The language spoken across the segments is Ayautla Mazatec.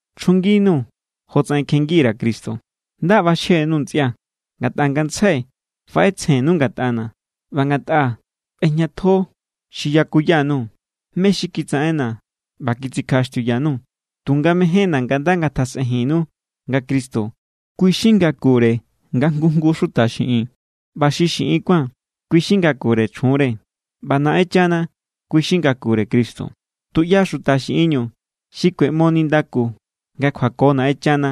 Chjunginuu̱ jotsaꞌen kjengi_ra̱ Cristo. Nda ꞌbaxje_nuu̱ ntsꞌia̱, ngatꞌa ngantsjai faꞌetsjennu ngatꞌana̱ ꞌba ngatꞌa ꞌbejñatjo xi yakuya_nuu̱, mé= xi kitsaꞌena̱ ꞌba kitsikjaꞌaxtiuya_nuu̱. Tunga mejénna̱ nga nda ngatasꞌejinnu nga Cristo, kui xi ngakure nga jngu jngu xuta xiꞌin. ꞌBa xi xiꞌin kuán, kui xi ngakure chjunre. ꞌBa Naꞌenchana, kui xi ngakure Cristo. Tuꞌya xuta xiꞌinñu xi kueꞌmo nindaku nga kjuako Naꞌenchana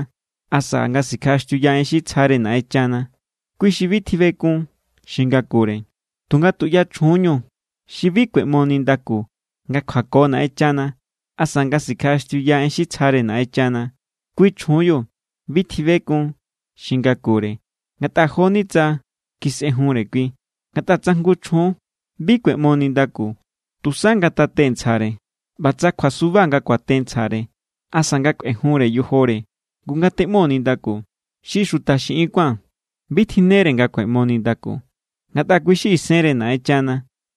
asa nga sikjaꞌaxtiuya en xi tsjare Naꞌenchana, kui xi bi tjibekun xi ngakure. Tunga tuꞌya chjunñu xi bi kueꞌmo nindaku nga kjuako Naꞌenchana asa nga sikjaꞌaxtiuya en xi tsjare Naꞌenchana, kui chjunbiu bi tjibekun xi ngakure ngatꞌa jo=ni tsa kisꞌejunre kui. Ngatꞌa tsa jngu chjun bi kueꞌmo nindaku, tusa ngatate ntsjare. ꞌBa tsa kjuasuba nga kuate ntsjare asa nga kꞌuejunre yojore, ngu, ngateꞌmo nindaku. Xi xuta xiꞌin kuán bi tjinnere nga kueꞌmo nindaku. Ngatꞌa kui= xi isenre Naꞌenchana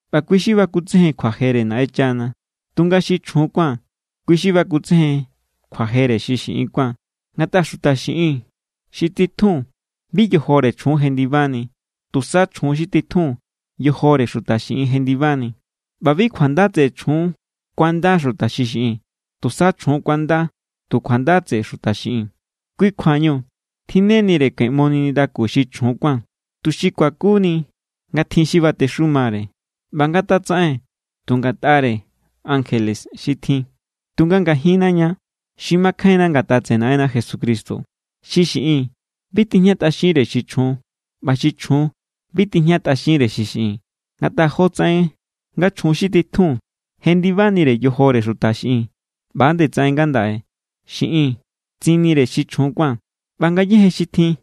ꞌba kui xi bakutsejen kjuajere Naꞌenchana. Tunga xi chjun kuán, kui xi bakutsejen kjuajere xi xiꞌin kuán. Ngatꞌa xuta xiꞌin xi titjun bi yojore chjun jendibani. Tusa chjun xi titjun yojore xuta xiꞌin jendibani. ꞌBa bi kjuanda tseꞌe chjun kuanda xuta xiꞌin. Tusa chjun kuanda tu kjuanda tseꞌe xuta xiꞌin. Kui kjuañu tjinnenire kueꞌmoni nindaku xi chjun kuán, tuxi kuakuni nga tjin xi batexumare. ꞌBa ngatatsaꞌen tu ngatꞌare ankjele xi tjin. Tunga ngajinna ña xi makjainna ngatꞌa tseꞌe Naꞌenna Jesucristo, xi xiꞌin bi tijñatꞌaxinre xi chjun, ꞌba xi chjun bi tijñatꞌaxinre xi xiꞌin. Ngatꞌa jotsaꞌen nga chjun xi titjun jendibanire yojore xuta xiꞌin, ꞌba=nde tsaꞌen ngandaꞌe xiꞌin tsinnire xi chjun kuán. ꞌBa ngayéje xi tjin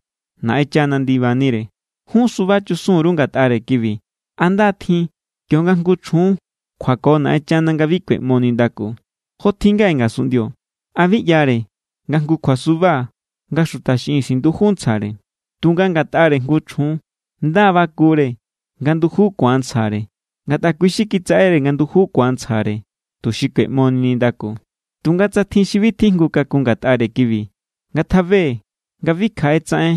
Naꞌenchana ndibanire. Jun suba chusun_ru ngatꞌare kibi. ¿A nda= tjin kionga jngu chjun kjuako Naꞌenchana nga bi kueꞌmo nindaku? Jo tjin ngaꞌe ngasunꞌndio, ¿a bi ꞌyare nga jngu kjuasuba nga xuta xiꞌin sinduju ntsjare? Tunga ngatꞌare jngu chjun, nda= bakure nga nduju ku̱an ntsjare, ngatꞌa kui xi kitsaꞌere nga nduju ku̱an ntsjare, tuxi kueꞌmoni nindaku. Tunga tsa tjin xi bi tjijngu kakun ngatꞌare kibi, ngatjabe nga bi kjaꞌe tsaꞌen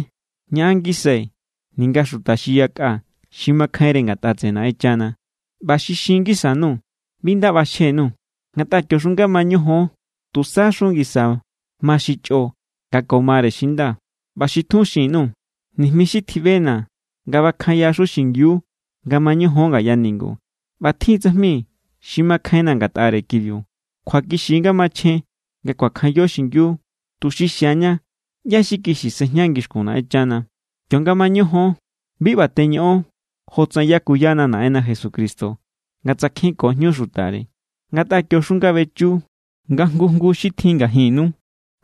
ñaꞌan ngisai ninga xuta xi yakꞌa xi makjainre ngatꞌa tseꞌe Naꞌenchana. ꞌBa xi xin ngisa_nuu̱, bi nda ꞌbaxje_nuu̱. Ngatꞌa kioxu nga mañojon, tusaxu ngisa ma xi chꞌo nga ko mare xi nda. ꞌBa xi tjun xin_nuu̱ nijmi xi tjiꞌbena̱ nga bakjanyaxu xingiu nga mañojon ngaya ningu. ꞌBa tjin= tsajmi xi makjainna̱ ngatꞌare kibiu. Kjuakixi= nga machjen nga kuakjanyo xingiu, tuxi xiaña ꞌyá= xi kixi sejña ngixkun Naꞌenchana. Kionga mañojon, bi ꞌba teñoꞌon jotsaꞌen yakuyana Naꞌenna Jesucristo nga tsakjenko jñu xutare. Ngatꞌa kioxu nga bechiu, nga jngu jngu xi tjin ngajinnu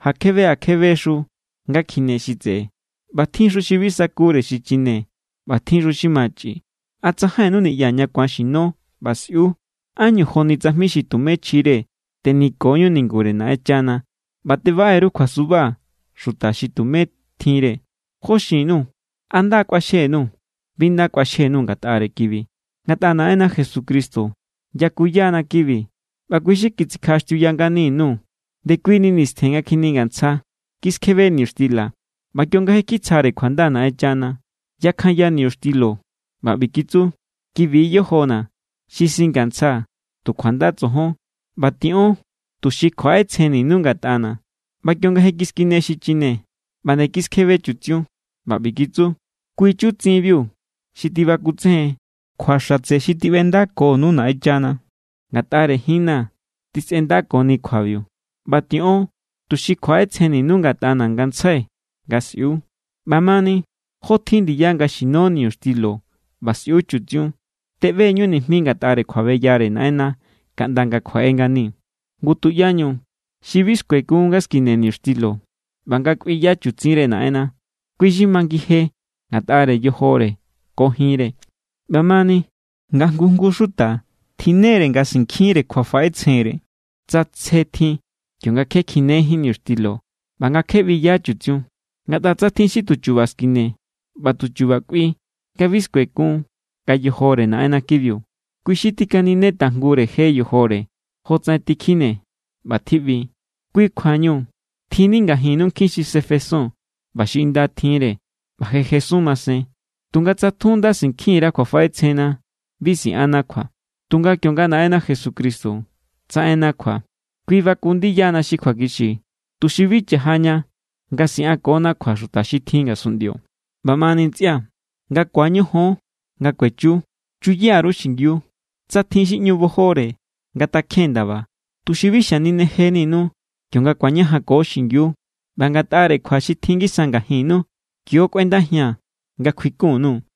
ja kjebe ja kjebexu nga kjine xi tseꞌe. ꞌBa tjinxu xi bi sakure xichine ꞌba tjinxu xi machꞌi. ¿A tsajainnu niꞌya ña ku̱an xino ꞌba sꞌiu? ¿Ánñu joni tsajmi xi tumé chjire teniko=ñu ningure Naꞌenchana ꞌba tebaꞌe_ru kjuasuba xuta xi tumé tjinre? ¿Jó xin_nuu̱? ¿A nda= kꞌuaxjenu? Bi nda kꞌuaxjenu ngatꞌare kibi. Ngatꞌa Naꞌenna Jesucristo yakuyana̱ kibi, ꞌba kui xi kitsikjaꞌaxtiuya ngani_nuu̱. Ndekuini nistjen nga kjiningantsja, kiskjebe niñuxtila. ꞌBa kionga je= kitsjare kjuanda Naꞌenchana, yakjanya niñuxtilo ꞌba ꞌbi kitsu: “Kibi= yojona̱ xi singantsjaa̱ tu kjuanda tsojon. ꞌBa tiꞌon tuxi kjuaꞌetsjenninu ngatꞌana̱.” ꞌBa kionga je kiskine xichine, ꞌba nde kiskjebe chutsiun, ꞌba ꞌbi kitsu: “Kui= chutsinbiu xi tibakutsejen kjua xatse xi tiꞌbendakonu Naꞌenchana. Ngatꞌare jinna̱ tisꞌendakoni kjuabiu. ꞌBa tiꞌon tuxi kjuaꞌetsjenninu ngatꞌana̱ ngantsjai nga sꞌiu.” ꞌBamani, jotjin ndiya nga xino niñuxtilo ꞌba sꞌiu chutsiun, teꞌbeñu nijmi ngatꞌare kjuabeyare Naꞌenna kaꞌnda nga kjuaꞌe ngani. Ngu, tuꞌyañu xi bi skuekun nga skine niñuxtilo ꞌba nga kꞌuiya chutsinre Naꞌenna, kui xi majngije ngatꞌare yojore ko jinre. ꞌBamani, nga jngu jngu xuta tjinnere nga sinkjinre kjuafaꞌetsjenre tsa tsje tjin, kionga kje kjinejín niñuxtilo ꞌba nga kje ꞌbiyaá chutsiun. Ngatꞌa tsa tjin xi tuchuba skine ꞌba tuchuba kꞌui nga bi skuekun nga yojore Naꞌenna kibiu, kui xi tikanine tajngure je yojore jotsaꞌen tikjine ꞌba tjiꞌbi. Kui= kjuañu tjinni ngajinnu nkjin xi sefesun ꞌba xi inda tjinre, ꞌba je jesun masen. Tunga tsa tjun nda sinkjin_ra kjuafaꞌetsjenna, bi siꞌanna kjua. Tunga kionga Naꞌenna Jesucristo tsaꞌenna kjua, kui baku ndiyana xi kjuakixi, tuxi bi cha̱jaña nga siꞌankona kjua xuta xi tjin ngasunꞌndio. ꞌBamani ntsꞌia̱, nga ku̱añojon nga kuechiu, chuya_ru xingiu. Tsa tjin xi ꞌñu bojore, ngatakjen ndaba, tuxi bi xaninejeninu kionga ku̱añajanko xingiu. ꞌBa ngatꞌare kjua xi tjin ngisa ngajinnu, kio= kꞌuendajia̱n nga̱ kjuikun_nuu̱.